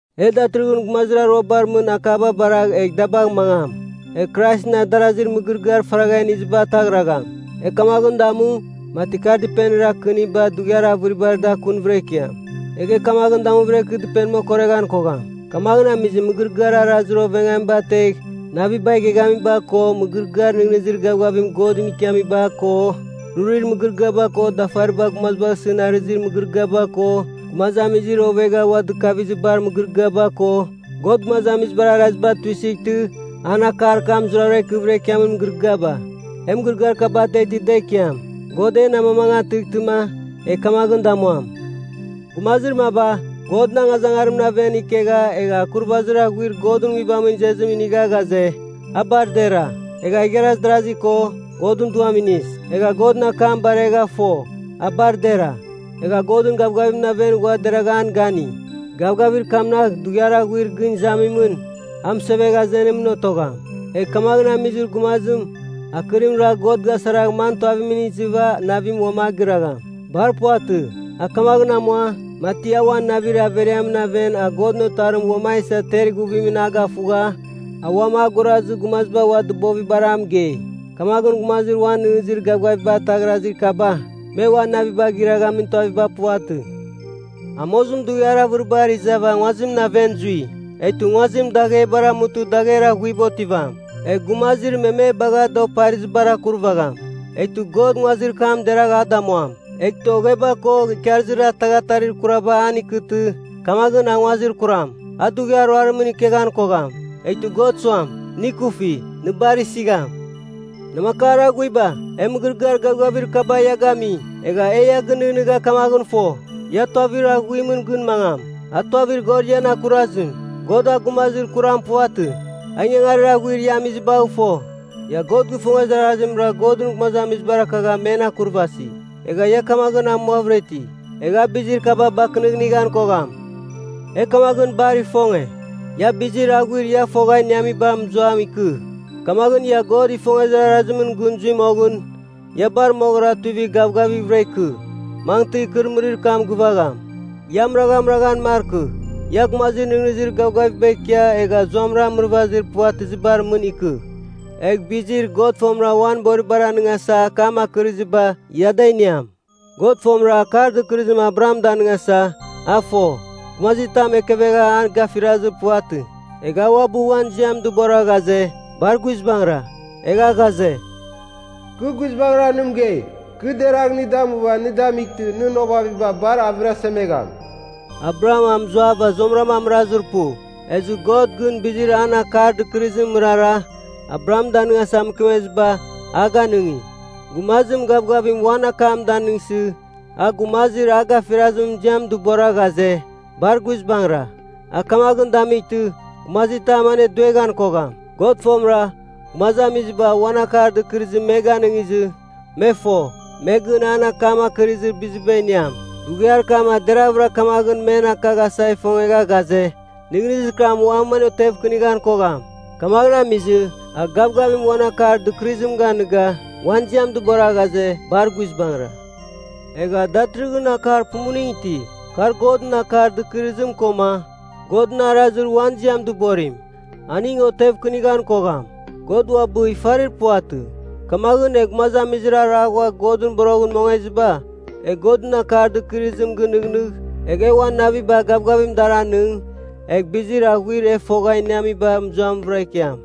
E datɨrɨghɨn gumazir aruabar mɨn akaba baragh egh da bagh mangam, egh Kraisɨn adarazir mɨgɨrɨgɨar faragha iniziba ataghragham. E kamaghɨn damu, mati kar dɨpenir akɨniba dughiar avɨribar da kunvɨra ikiam, egh e kamaghɨn damuvɨra ikɨ dɨpenim okoreghan kogham. Kamaghɨn amizɨ, mɨgɨrɨgɨar arazir oveghamiba ategh naviba igheghamiba ko, mɨgɨrɨgɨar nɨghnɨzir gavgavim Godɨn ikiamiba ko, rurir mɨgɨrɨgɨaba ko dafariba gumazibagh isɨn arɨzir mɨgɨrɨgɨaba ko, gumazamizir ovegha ua dɨkavizibar mɨgɨrɨgɨaba ko, God gumazamizibar araziba tuisɨghtɨ an akar kam zurara ikɨvɨra ikiamin mɨgɨrɨgɨaba, e mɨgɨrɨgɨar kaba da ateghtɨ da ikiam. God en amamangatɨghtɨma, e kamaghɨn damuam. Gumazir maba, Godɨn angazangarimɨn aven ikegha egha akurvazir aghuarir Godɨn Nguibamɨn izezim inigha ghaze, a bar dera, egha igharaz darazi ko, Godɨn Duam inis. Egha Godɨn akam baregha fo, a bar dera. Egha Godɨn gavgavimɨn aven ghua deragha an gani, gavgavir kamnagh dughiar aghuir gɨn izamimɨn a mɨsevegh azenimɨn otogham. Egh kamaghɨn amizir gumazim, akɨrim ragh God gasaragh man tuavitamɨn izɨva navim uam agɨragham? Bar puvatɨ. A kamaghɨn amua, mati a uan navir averiamɨn aven a Godɨn Otarim uam a isa ter ighuvim gafugha, a uam a gurazɨ gumaziba ua dɨbovibar a mɨgei. Kamaghɨn gumazir uan nɨghnɨzir gavgaviba ataghrazir kaba, me ua naviba giraghamin tuaviba puvatɨ. Amozim dughiar avɨribar izava nguazimɨn aven zui. Eghtɨ nguazim daghebar amutɨ dagher aghuiba otivam, egh gumazir me me bagha da oparizibar akurvagham. Eghtɨ God nguazir kam deragh a damuam. Eghtɨ ogheba ko ikarɨzir ataghatarir kuraba an ikɨtɨ, kamaghɨn a nguazir kuram. A dughiar ruarim ikeghan kogham, eghtɨ God suam, nɨ ikufi, nɨ bar isigham. Namakar aghuiba, e mɨgɨrɨgɨar gavgavir kaba ia gami. Egha e ia gɨnɨghnɨgha kamaghɨn fo, ia tuavir aghuimɨn gɨn mangam, a tuavir God ian akurazim. God a gumazir kuram puvatɨ, a ingangarir aghuir ia amizibagh fo, ia God gifongezir arazimra Godɨn gumazamizibar akagha men akurvasi, egha ia kamaghɨn amuavɨra iti. Egh a bizir kaba bakɨnɨghnighan kogham. E kamaghɨn bar ifonge, ia bizir aghuir ia fogha iniamiba mɨzuam ikɨ, kamaghɨn ia God gifongezir arazimɨn gɨn zui moghɨn, ia bar moghɨra tuivigh gavgavighvɨra ikɨ, mangɨtɨ ikɨrɨmɨrir kam gɨvagham. Ia amɨraghamɨraghan markɨ. Ia gumazir nɨghnɨzir gavgavim ikia egha zuamɨra amɨrazir puvatɨzibar mɨn ikɨ. Egh bizir God fomɨra uan boribar anɨngasa akam akɨriziba, ia da iniam. God fomɨra akar dɨkɨrɨzim Abraham danɨngasa, a fo, gumazitam ekevegha a gafirazir puvatɨ, egha a uabɨ uan ziam dɨbora ghaze, bar guizbangɨra. Egha ghaze, “Kɨ guizbangɨra nɨ mɨgei, kɨ deragh nɨ damuva nɨ damightɨ nɨn ovaviba bar avɨrasemegham.” Abraham a mɨzuava zuamɨra amɨrazir pu, ezɨ God, gɨn bizir an akar dɨkɨrɨzimɨn mɨrara Abraham danɨngasa mɨkemeziba, a ganɨngi. Gumazim gavgavim uan akam danɨngsɨ, a gumazir a gafirazimɨn ziam dɨbora ghaze, bar guizbangɨra. A kamaghɨn damightɨ, gumazitam anedueghan kogham. God fomɨra, gumazamiziba uan akar dɨkɨrɨzim me ganɨngizɨ, me fo, me gɨn an akam akɨrɨzir biziba iniam. Dughiar kam a deraghvɨra kamaghɨn men akaghasa ifongegha ghaze, nɨghnɨzir kam uam an otevkɨnighan kogham. Kamaghɨn amizɨ, a gavgavim uan akar dɨkɨrɨzim ganɨga uan ziam dɨbora ghaze, bar guizbangɨra. Egha datɨrɨghɨn akar pumuning iti, kar Godɨn akar dɨkɨrɨzim, koma Godɨn arazir uan ziam dɨborim, aning otevkɨnighan kogham. God uabɨ ifarir puvatɨ. Kamaghɨn e gumazamizir ara ghua Godɨn boroghɨn mongeziba, e Godɨn akar dɨkɨrɨzim gɨnɨghnɨgh egh e uan naviba gavgavim dar anɨng, egh bizir aghuir e fogha iniamiba mɨzuamvɨra ikiam.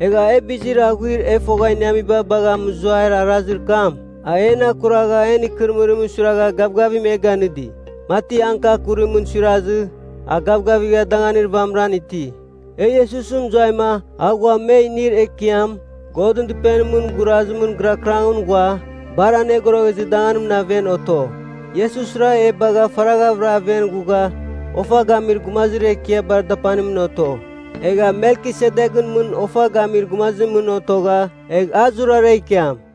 Egha e bizir aghuir e fogha iniamiba bagha mɨzuair arazir kam, a en akuragha en ikɨrɨmɨrimɨn suiragha gavgavim e ganɨdi, mati angka kurimɨn suirazɨ a gavgavigha danganir vamɨran iti. E Iesus mɨzuaima a ghua me inir ekiam Godɨn Dɨpenimɨn gurazimɨn gɨrakɨrangɨn ghua Bar Anogoroghezir Danganimɨn aven oto. Iesusra e bagha faraghavɨra aven ghugha Ofa Gamir Gumazir Ekiabar Dapanimɨn oto. Egha Melkisedeghɨn mɨn Ofa Gamir Gumazimɨn otogha, egh a zurara ikiam.